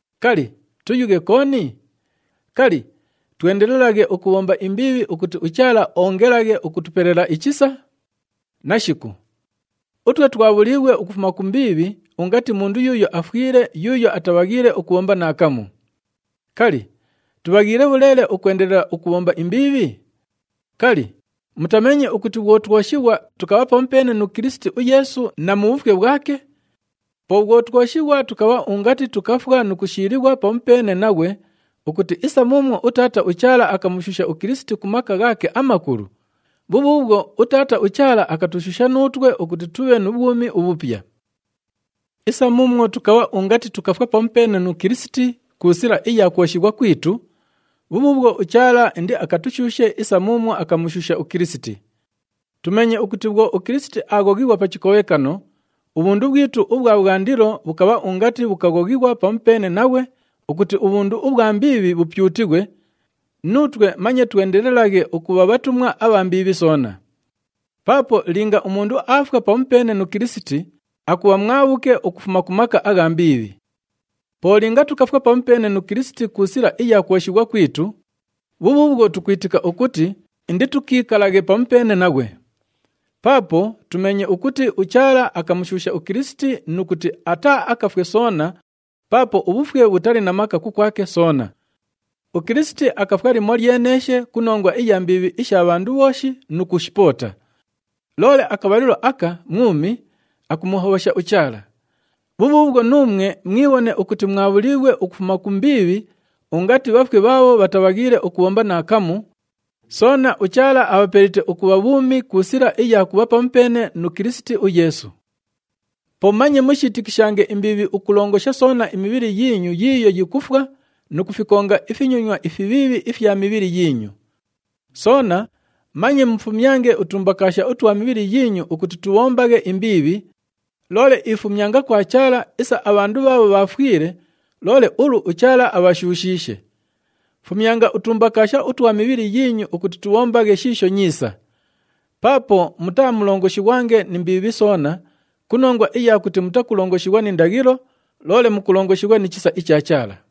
Kali, tuyughe kooni? Kali, twendelelaghe ukubhomba imbiibhi ukuti uChaala oongelaghe ukutupelela ichisa? Nashiku! Utwe twabhuliighwe ukufuma ku mbiibhi ungati mundu yuuyo afwile yuuyo atabhaghiile ukubhomba naakamu. Kali, tubhaghiile bhuleele ukwendelela ukubhomba imbiibhi? Kali, mutameenye ukuti bhwo twoshighwa, tukabha pamupeene nu Kilisiti uYeesu na mu bhufwe bhwake? Po bhwo twoshighwa, tukabha ungati tukafwa nu kushiilighwa pamupeene naghwe ukuti isa muumwo uTaata uChaala akamushuusha uKilisiti ku maka ghaake amakulu, bhubhuubhwo uTaata uChaala akatushuusha nuutwe ukuti tubhe nu bhwumi ubhupya. Isa muumwo tukabha ungati tukafwa pamupeene nu Kilisiti ku sila iya kwoshighwa kwitu, bhubhuubhwo uChaala indiakatushuushe isa muumwo akamushuusha uKilisiti. Tumeenye ukuti bhwo uKilisiti aaghoghighwa pa chikobhekano, ubhundu bhwitu ubhwa bhwandilo bhukabha ungati bhukaghoghighwa pamupeene naghwe ukuti ubhundu ubhwa mbiibhi bhupyutighwe, nuutwe manye twendelelaghe ukubha bhatumwa abha mbiibhi soona. Paapo linga umundu aafwa pamupeene nu Kilisiti, akubha mwabhuke ukufuma ku maka agha mbiibhi. Po linga tukafwa pamupeene nu Kilisiti ku sila iya kwoshighwa kwitu, bhubhuubhwo tukwitika ukuti inditukiikalaghe pamupeene naghwe. Paapo tumeenye ukuti uChaala akamushuusha uKilisiti nu kuti ataaakafwe soona paapo ubhufwe bhutali na maka kukwake soona. UKilisiti akafwa limolyeneeshe ku nongwa iya mbiibhi isha bhandu bhooshi nu kushipoota. Loole akabhalilo aka mwumi, akumuhobhosha uChaala. Bhubhuubhwo nuumwe mwibhone ukuti mwabhuliighwe ukufuma ku mbiibhi ungati bhafwe bhaabho bhatabhaghiile ukubhomba naakamu, soona uChaala abhapelite ukubha bhuumi ku sila iya kubha pamupeene nu Kilisiti uYeesu. Po manye mushiitikishange imbiibhi ukulongosha soona imibhili yiinyu yiiyo yikufwa nu kufikonga ifinyonywa ifibhiibhi ifya mibhili yiinyu. Soona manye mufumyange utumbakaasha utwa mibhili yiinyu ukuti tubhombaghe imbiibhi, loole ifumyanga kwa Chaala isa abhandu bhaabho bhaafwile, loole ulu uChaala abhashuushiishe. Fumyanga utumbakaasha utwa mibhili yiinyu ukuti tubhombaghe shiisho nyiisa. Paapo mutaamulongoshighwange ni mbiibhi soona ku nongwa iya kuti mutakulongoshighwa ni ndaghilo, loole mukulongoshighwa ni chisa icha Chaala.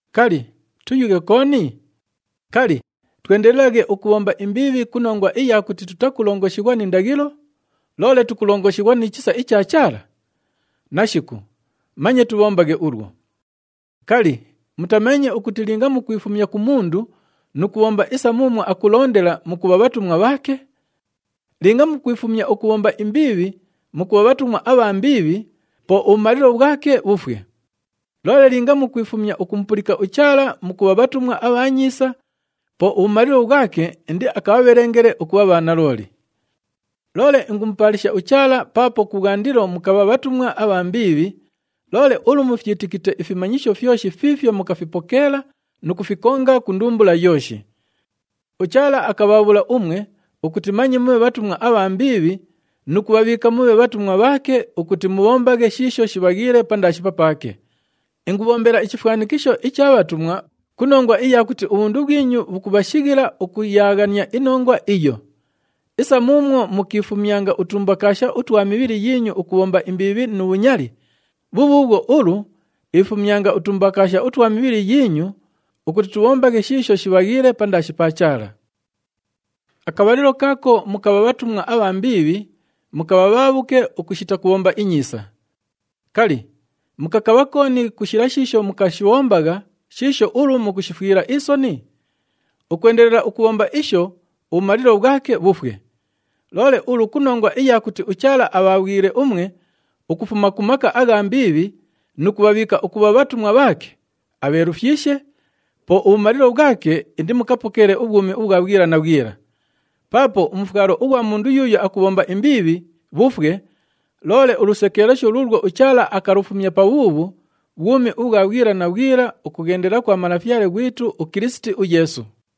Kali, tuyughe kooni? Kali, twendelelaghe ukubhomba imbiibhi ku nongwa iya kuti tutakulongoshighwa ni ndaghilo, loole tukulongoshighwa ni chisa icha Chaala? Nashiku! Manye tubhombaghe ulwo. Kali, mutameenye ukuti linga mukwifumya ku mundu nu kubhomba isa muumwo akulondela, mukubha bhatumwa bhaake? Linga mukwifumya ukubhomba imbiibhi mukubha bhatumwa abha mbiibhi, po ubhumalilo bhwake bhufwe. Loole linga mukwifumya ukumupulika uChaala mukubha bhatumwa abha nyiisa, po ubhumalilo bhwake indiakabhabhelengele ukubha bhanalooli. Loole ingumupaalisha uChaala paapo kubhwandilo mukabha bhatumwa abha mbiibhi, loole ulu mufyitikite ifimanyisho fyoshi fiifyo mukafipokeela nu kufikonga ku ndumbula yooshi. UChaala akabhaabhula umwe ukuti manye mubhe bhatumwa abha mbiibhi nu kubhabhiika mubhe bhatumwa bhaake ukuti mubhombaghe shiisho shibhaghiile pandaashi papaake. Ingubhombela ichifwanikisho icha bhatumwa ku nongwa iya kuti ubhundu bhwinyu bhukubhashighila ukuyaaghania inongwa iyo. Isa muumwo mukiifumyanga utumbakaasha utwa mibhili yiinyu ukubhomba imbiibhi nu bhunyali, bhubhuubhwo ulu ifumyanga utumbakaasha utwa mibhili yiinyu ukuti tubhombaghe shiisho shibhaghiile pandaashi pa Chaala. Akabhalilo kaako mukabha bhatumwa abha mbiibhi, mukabha bhaabhuke ukushita kubhomba inyiisa. Kali, mukakabha kooni ku shila shiisho mukashibhombagha shiisho ulu mukushifwila isoni? Ukwendelela ukubhomba isho, ubhumalilo bhwake bhufwe. Loole ulu ku nongwa iya kuti uChaala abhaabhwile umwe ukufuma ku maka agha mbiibhi nu kubhabhiika ukubha bhatumwa bhaake, abheelufyishe, po ubhumalilo bhwake indimukapokeele ubhwumi ubhwa bhwila na bhwila. Paapo umufwalo ughwa mundu yuuyo akubhomba imbiibhi, bhufwe, loole ulusekeelesho luulwo uChaala akalufumya pabhuubhu, bhwumi ubhwa bhwila na bhwila ukughendela kwa Malafyale ghwitu uKilisiti uYeesu.